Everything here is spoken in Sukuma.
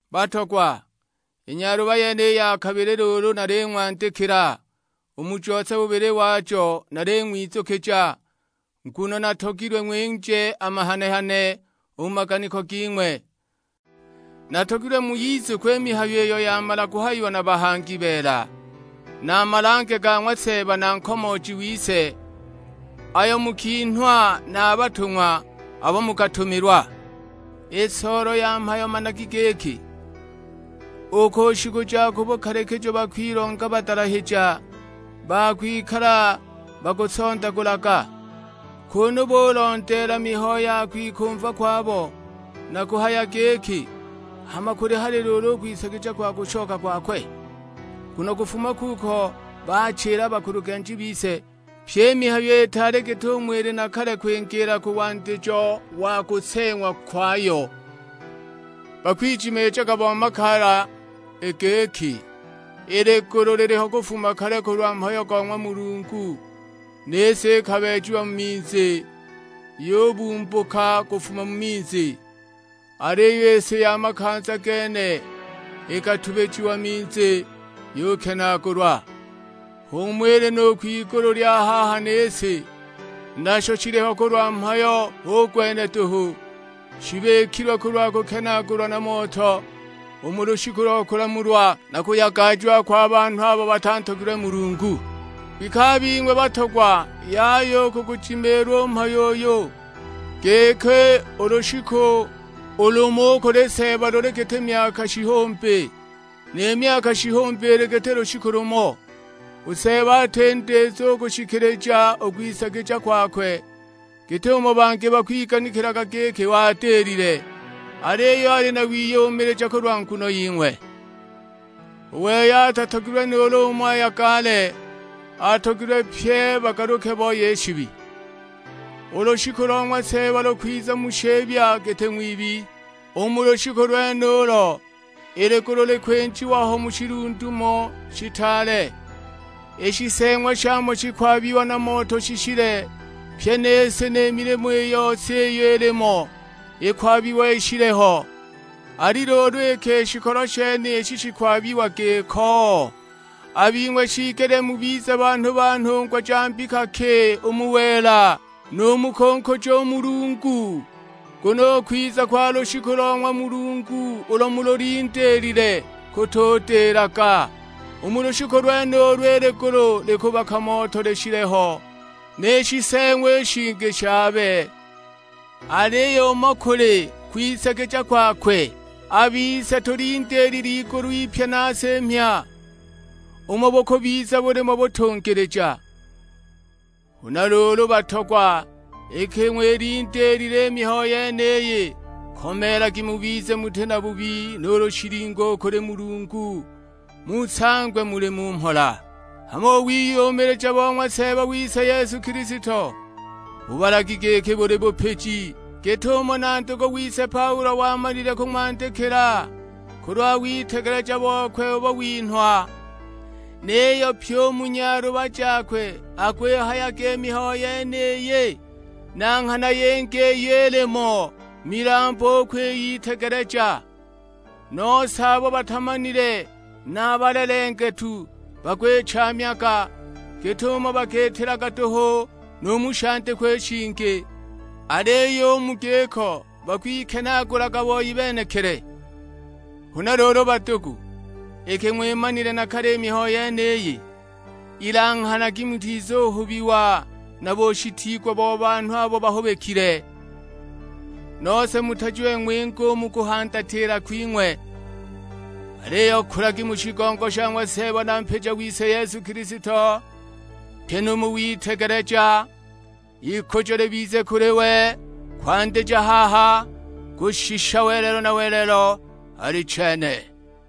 Batogwa, i nyaluba yeniyi ya kabili luulu naling'wandikila. U mu jose bubili wajo naling'wizukija, nguno natogilwe ng'winje a mahane-hane u mu maganiko ging'we. Natogilwe muyizukwe i mihayo iyo yamala kuhayiwa na bahangi beela; na a malange ga ng'wa Seeba na Nkomooji wise, ayo mukinhwa na a batung'wa abo mukatumilwa. I soolo ya mhayo managi giki, u ku shiku ja ku bukalikijo bakwilonga badalahija ba kwikala bakusondagulaga, kunu bulondeela mihayo ya kwikumva kwabo; na kuhaya giki, "Hama kuli hali luulu u kwisagija kwa kushoka kwakwe? Nguno kufuma kuko bachila a bakulugenji bise, pyi i mihayo itaali git'umo ili na kale kwingiila ku wandijo wa kuseeng'wa kwayo!" Bakwijimiijaga bo makaala i giki, i ligulu liliho kufuma kale kulwa mhayo go ng'wa Mulungu; ni si ikabeejiwa mu minzi, yubumbuka kufuma mu minzi. Aliyo i si ya makanza gene ikatubijiwa minzi, yukenaagulwa. H'umo ili nu kwigulu lya haha ni si; nasho shiliho kulwa mhayo hu gwenuyo duhu, shibikilwe kulwa kukenaagulwa na moto u mu lushiku lo kulamulwa na kuyagajiwa kwa banhu abo batantogilwe Mulungu. Kwike a bing'we batogwa yaya u kugujimiilwa u mhayo uyu, giki u lushiku u lumo u kuli Seeba luli giti myaka shihumbi, ni myaka shihumbi ili giti lushiku lumo. U Seeba ati ndizu u kushikilija u kwisagija kwakwe, git'umo bangi bakwiganikilaga giki wadilile; aliyo ali na wiyumilija kulwa nguno ying'we. U wei atatogilwe nuulu umo ayagale, atogilwe pye bagaluke booye i shibi. U lushiku lo ng'wa Seeba lukwiza mu shibya giti ng'wibi, u mu lushiku lwenulo i ligulu likwinjiwa ho mu shilundumo shitaale; i shiseeng'wa shamo shikwabiwa na moto shishile, pyi ni si ni milimo i yose iyo ilimo ikwabiwa ishile ho! Ali luulu iki i shikolo shenishi shikwabiwa giko, a bing'we shiigelile mubize banhu ba nhungwa ja mbika ki u mu wela, nu mu kunkuja u Mulungu? Nguno u kwiza kwa lushiku lo ng'wa Mulungu ulo mululindiilile kutudilaga; u mu lushiku lwenulo i ligulu likubaka moto lishile ho, ni shiseeng'wa i shingi shaabe! Aliyo umo kuli kwisagija kwakwe, a bise tulindiilile igulu ipya na si mhya, umo bukubiza bulimo butungilija. Huna luulu batogwa iki ng'wilindiilile i mihayo yeniyi, komeelagi mubize muti na bubi nuulu shilingo u kuli Mulungu, musangwe muli mu mhola. Hama u wiyumilija bo ng'wa Seeba wise Yesu Kilisto, bubalagi giki buli bupiji; git'umo na ndugu wise Paulo wamalile kung'wandikila kulwa witegeleja bokwe ubo winhwa. Niyo pyi u mu nyaluba jakwe akwihayaga i mihayo yeniyi; na nghana yingi iyo ilimo milambu u kwiyitegeleja. Nose abo batamanile na a balelengetu bakwichaamyaga, git'umo bakiitilaga duhu nu mu shandikwa i shingi; aliyo u mu giko bakwikenaagulaga boi benekili! Huna luulu badugu, iki ng'wimanile na kale i mihayo yeniyi, ilanghanagi mutizuhubiwa na bushitiigwa bo banhu abo bahubikile, nose mutajiwe ng'winge u mu kuhandatila kwing'we. Aliyo kulagi u mu shigongo sha ng'wa Seeba na Mpija wise Yesu Kilisto, pyi nu mu witegeleja. Ikujo libize kuli we kwandija haha kushisha welelo na welelo: Alichene.